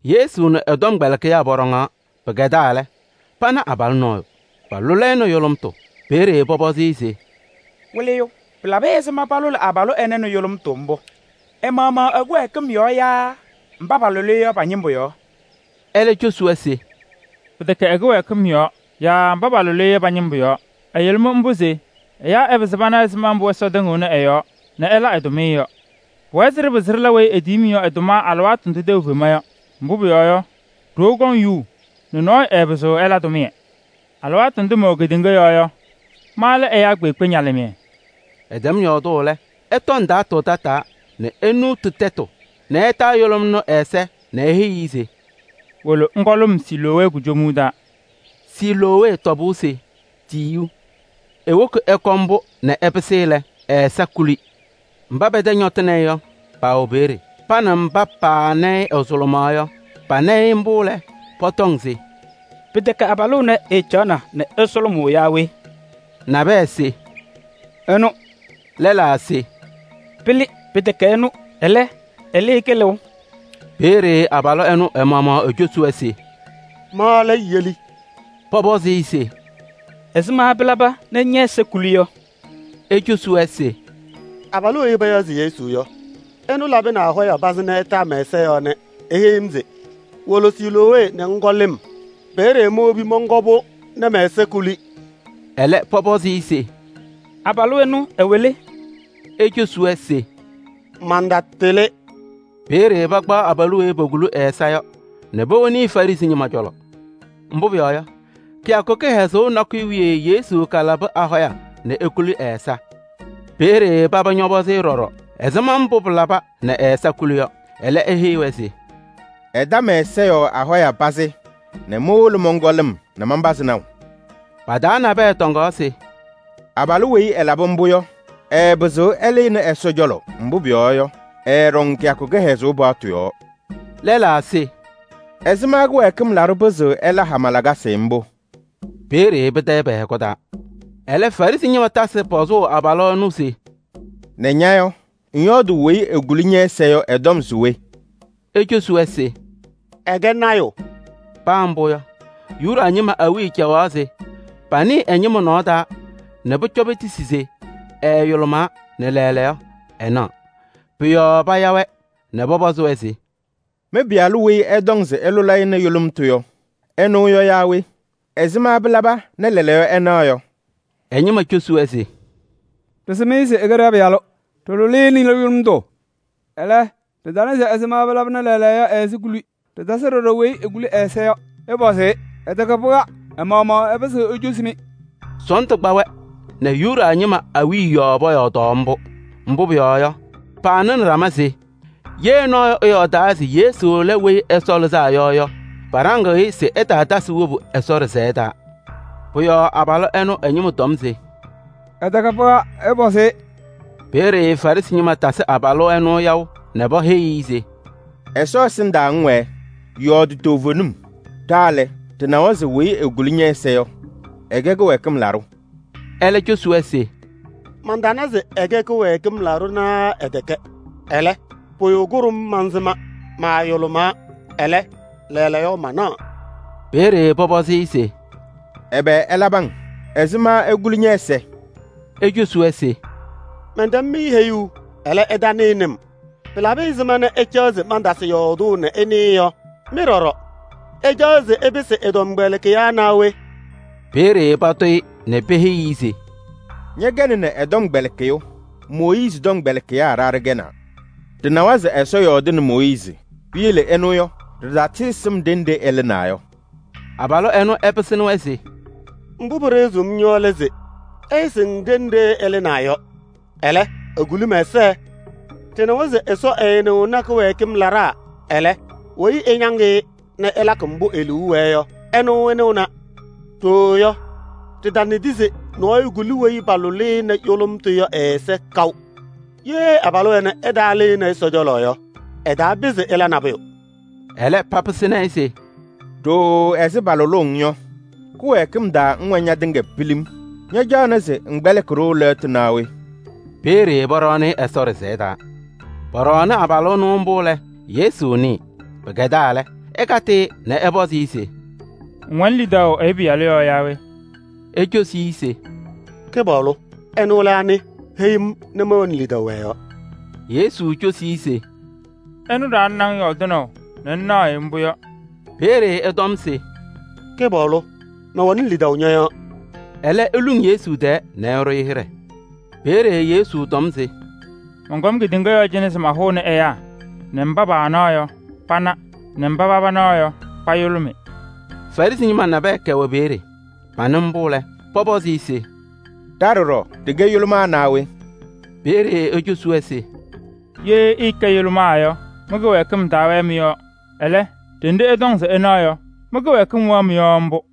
Yesu nɛ ɛ-tɔmkpɛlɩkɩyaa pɔɖɔŋaɣ. Pɩkɛdaa lɛ, pana abalʋ nɔɔyʋ, palʋlɩ-ɩ nɛ yʋlʋmtʋ. Peeye pɔpɔzɩ-ɩ se: “Wɩlɩyʋ! Pɩlabɩ ɛzɩma palʋlɩ abalʋ ɛnɛ nɛ yʋlʋmtʋ mbʋ? Ɛ-maɣmaɣ ɛ-kɩwɛɛkɩm yɔɔ yaa mba palʋlɩ-ɩ yɔ pa-ñɩmbʋ yɔɔ?” Ɛlɛ ecosi-wɛ se: “Pɩtɛkɛ ɛ-kɩwɛɛkɩm yɔɔ yaa mba palʋlɩ-ɩ yɔ pa-ñɩmbʋ yɔɔ. Ɛyʋlʋmɩ mbʋ se ɛyaa ɛpɩzɩ pana ɛzɩma mbʋ Ɛsɔ tɩŋɩɣnɩ ɛ-yɔɔ nɛ ɛla ɛ-tʋmɩyɛ yɔ. Pʋwɛɛ se ɖɩla weyi etiyi-m yɔ ɛ-tʋma alɩwaatʋ ndʋ tɛʋ fema yɔ. Mbʋ pʋyɔɔ yɔ, ɖoo kɔŋ yuu nɛ nɔɔyʋ ɛɛpɩzɩɣ ɛla tʋmɩyɛ. Alɩwaatʋ ndʋ mɛwɛ kedeŋa yɔɔ yɔ, ma lɛ ɛyaa kpeekpe ñalɩmɩyɛ.” Ɛtɛm yɔɔdʋʋ mbʋ lɛ, ɛtɔ ndaatʋ tataa nɛ enuuti tɛtʋ nɛ ɛtaa yʋlʋm ɛnʋ ɛ-ɛza nɛ eheyi-i se: “Wolo ŋkɔ lɩm Siloowee kujomuu taa.” Siloowee tɔbʋʋ se Tiyiyu. Ewobi ɛkɔ mbʋ nɛ ɛpɩsɩ lɛ, ɛ-ɛza kuli. Mba pɛ-tɛ ñɔtɩnɩ-ɩ yɔ, paawɛ peeye. Pa nɛ mba paana-ɩ ɛsʋlʋmaɣ yɔ, pana-ɩ mbʋ lɛ, pɔtɔŋ se: “Pɩtɛkɛ abalʋ ɛnɛ ɛɛcaɣna nɛ ɛsʋlʋmʋʋ yaa we?” Nabɛyɛ se: “Ɛnʋ.” Lɛlaa se: “Pɩlɩ! Pɩtɛkɛ ɛnʋ, ɛlɛ, ɛlɩ-ɩ kɩlɩʋ.” Peeye abalʋ ɛnʋ ɛ-maɣmaɣ ecosi-wɛ se: “Ma lɛ yeli.” Pɔpɔzɩ-ɩ se: “Ɛzɩma pɩlaba nɛ ñɛ-ɛza kuli yɔ?” Ecosi-wɛ se: “Abalʋ weyi payaɣ se Yesu yɔ, ɛlabɩnɩ ahɔya pazɩ nɛ ɛtaa mɛ-ɛza yɔɔ nɛ eheyi-m se: ‘Wolo Siloowee nɛ ŋkɔ lɩm.’ Peeye mowobi mɔnkɔ-pʋ nɛ mɛ-ɛza kuli.” Ɛlɛ pɔpɔzɩ-ɩ se: “Abalʋ ɛnʋ ɛwɛ le?” Ecosi-wɛ se: “Mantatɩlɩ.” Peeye pakpaɣ abalʋ weyi pokuli ɛ-ɛza yɔ nɛ powoni Farɩsɩ ñɩma cɔlɔ. Mbʋ pʋyɔɔ yɔ, kɩyakʋ kɩhɛzʋʋ nakʋyʋ wiye Yesu kalabɩ ahɔya nɛ ekulini ɛ-ɛza. Peeye paba ñɔpɔzɩ-ɩ ɖɔɖɔ ɛzɩma mbʋ pɩlaba nɛ ɛ-ɛza kuli yɔ. Ɛlɛ eheyi-wɛ se: “Ɛta mɛ-ɛza yɔɔ ahɔya pazɩ nɛ mowolo mɔnkɔ lɩm nɛ manpazɩ naʋ.” Pʋ-yɔɔ pa-taa nabɛyɛ tɔŋaɣ se: “Abalʋ weyi ɛlabɩ mbʋ yɔ, ɛɛpɩzɩɣ ɛlɩnɩ Ɛsɔ cɔlɔ, mbʋ pʋyɔɔ yɔ, ɛɛɖɔŋ kɩyakʋ kɩhɛzʋʋ paɣtʋ yɔɔ.” Lɛlaa se: “Ɛzɩma kɩwɛɛkɩm laɖʋ pɩzɩɣ ɛla hama lakasɩ mbʋ?” Peeye pɩtayɩ pɛ-hɛkʋ taa. Ɛlɛ Farɩsɩ ñɩma tasɩ pɔzʋʋ abalʋ ɛnʋ se: “Nɛ ña yɔ, ŋyɔɔdʋʋ weyi ekuli ñɛ-ɛza yɔ ɛ-tɔm se we?” Ecosi-wɛ se: “Ɛkɛ lɔɔyaɣ tʋ.” Paa mbʋ yɔ, Yuda ñɩma awiya caɣaɣ se panɩɩ ɛ-ñɩma nɔɔ taa nɛ pʋcɔ petisi se ɛɛyʋlʋmaa nɛ lɛɛlɛɛyɔ ɛnaɣ. Pʋ-yɔɔ paya-wɛ nɛ pɔpɔzɩ-wɛ se: “Mɩ-pɩyalʋ weyi ɩtɔŋ se ɩlʋlɩ-ɩ nɛ yʋlʋmtʋ yɔ, ɛnʋ yɔ yaa we? Ɛzɩma pɩlaba nɛ lɛɛlɛɛyɔ ɛnaɣ?” Ɛ-ñɩma cosi-wɛ se: “Ɖɩsɩm-ɩ se ɛkɛ ɖa-pɩyalʋ, ɖɩlʋlɩ-ɩ nɛ yʋlʋmtʋ. Ɛlɛ, ɖɩtana se ɛzɩma pɩlaba nɛ lɛɛlɛɛyɔ ɛ-ɛza kuli. Ɖɩtasɩ ɖɔɖɔ weyi ekuli ɛ-ɛza yɔ. Ɩpɔzɩ-ɩ, ɛtɛkɛ pɩɣa, ɛ-maɣmaɣ ɛpɩzɩɣ ecosi-mɩ!” Sɔɔndʋ kpaɣaɣ-wɛ nɛ Yuda ñɩma awiya yɔɔ pɔyɔɔdaɣ mbʋ. Mbʋ pʋyɔɔ yɔ, paanɩnɩ ɖama se: “Ye nɔɔyʋ ɛyɔɔdaa se Yesu lɛ Weyi Ɛsɔ Lɩzaa Yɔ yɔ, paɖaŋ-ɩ se ɛtaatasɩ wobu Ɛsɔ ɖɩsɛyɛ taa.” Pʋ-yɔɔ abalʋ ɛnʋ ɛ-ñɩma tɔm se: “Ɛtɛkɛ pɩɣa, ɩpɔzɩ-ɩ!” Peeye Farɩsɩ ñɩma tasɩ abalʋ ɛnʋ yaʋ nɛ peheyi-i se: “Ɛsɔ ɛsɩndaa ŋwɛɛ, yɔɔdɩ toovenim. Ɖa lɛ, ɖɩnawa se weyi ekuli ñɛ-ɛza yɔ, ɛkɛ kɩwɛɛkɩm laɖʋ.” Ɛlɛ ecosi-wɛ se: “Mantana se ɛkɛ kɩwɛɛkɩm laɖʋ naa ɛtɛkɛ. Ɛlɛ, pʋyʋ kʋɖʋm mansɩma: maayʋlʋmaa, ɛlɛ, lɛɛlɛɛyɔ manaɣ.” Peeye pɔpɔzɩ-ɩ se: “Ɛbɛ ɛlabɩ-ŋ? Ɛzɩma ekuli ñɛ-ɛza?” Ecosi se: “Mɛntɛm-mɩ heyuu, ɛlɛ ɩtanɩnɩ-m. Pɩlabɩ ɛzɩma nɛ ɩcaɣ se mantasɩ yɔɔdʋʋ nɛ ɩnɩɩ yɔ? Mɩ ɖɔɖɔ, ɩcaɣ se ɩpɩsɩ ɛ-tɔmkpɛlɩkɩyaa naa we?” Peeye patʋ-ɩ nɛ peheyi-i se: “Ñɛkɛnɩ ɛ-tɔmkpɛlɩkɩyʋ! Mooyiizi tɔmkpɛlɩkɩyaa ɖa ɖɛkɛnaa. Ɖɩnawa se Ɛsɔ yɔɔdɩnɩ Mooyiizi. Piyele ɛnʋ yɔ, ɖɩtatɩɩsɩm ɖenɖe ɛlɩnaa yɔ!” Abalʋ ɛnʋ ɛpɩsɩnɩ-wɛ se: “Mbʋ pɩɖɩɣzɩɣ-m yɔ lɛ se: ɩɩsɩŋ ɖenɖe ɛlɩnaa yɔ, ɛlɛ, ekuli mɛ-ɛza! Ɖɩnawa se Ɛsɔ ɛɛnɩɣnɩ kɩwɛɛkɩm laɖaa, ɛlɛ, weyi ɛñaŋ-ɩ nɛ ɛlakɩ mbʋ e-liu wɛɛ yɔ, ɛnʋ ɛnɩɣna. Ɖooo yɔ, ɖɩtanɩdɩ se nɔɔyʋ kuli weyi palʋlɩ-ɩ nɛ yʋlʋmtʋ yɔ ɛ-ɛza kaʋ. Ye abalʋ ɛnɛ ɛtaalɩnɩ Ɛsɔ cɔlɔ yɔ, ɛtaapɩzɩ ɛla nabʋyʋ.” Ɛlɛ papɩsɩnɩ-ɩ se: “Ɖooo ɛzɩ palʋlʋʋ-ŋ yɔ, kɩwɛɛkɩm taa ŋwɛ ñatɩŋa pilim. Ñacaɣnɩ se ŋkpɛlɩkɩ-ɖʋ yaa we?” Peeye pɔɖɔɔnɩ-ɩ Ɛsɔ ɖɩsɛyɛ taa. Pɔɖɔɔnɩ abalʋ ɛnʋ mbʋ lɛ, Yesu nɩɩ. Pɩkɛdaa lɛ, ɛkatɩ-ɩ nɛ ɛpɔzɩ-ɩ se: “Ŋwɛnɩ lidaʋ Ɛyʋ Pɩyalʋ yɔɔ yaa we?” Ecosi-i se: “Kɩpaɣlʋ! Ɛnʋ lɛ anɩ? Heyi-m nɛ mɛwɛnɩ lidaʋ ɛ-yɔɔ.” Yesu cosi-i se: “Ɛnʋ ɖaɣnɩnɩ-ŋ yɔɔdɩnaʋ nɛ ŋnaɣ-ɩ mbʋ yɔ.” Peeye ɛtɔm se: “Kɩpaɣlʋ! Mɛwɛnɩ lidaʋ ñɔ-yɔɔ.” Ɛlɛ eluŋ Yesu tɛɛ nɛ ɛɖʋ-ɩ hɩɖɛ. Peeye Yesu tɔm se: “Mɔnkɔm kedeŋa yɔɔ cɩnɛ se mahʋnɩ ɛyaa nɛ mba paanaɣ yɔ, pana nɛ mba paba naɣ yɔ, payʋlʋmɩ.” Farɩsɩ ñɩma nabɛyɛ kɛwɛ peeye. Panɩ mbʋ lɛ, pɔpɔzɩ-ɩ se: “Ɖa ɖɔɖɔ ɖɩkɛ yʋlʋmaa naa we?” Peeye ecosi-wɛ se: “Ye ɩɩkɛ yʋlʋmaa yɔ, mɩ-kɩwɛɛkɩm taawɛɛ mɩ-yɔɔ. Ɛlɛ, ɖenɖe ɩtɔŋ se ɩnaɣ yɔ, mɩ-kɩwɛɛkɩm wɛɣ mɩ-yɔɔ mbʋ.”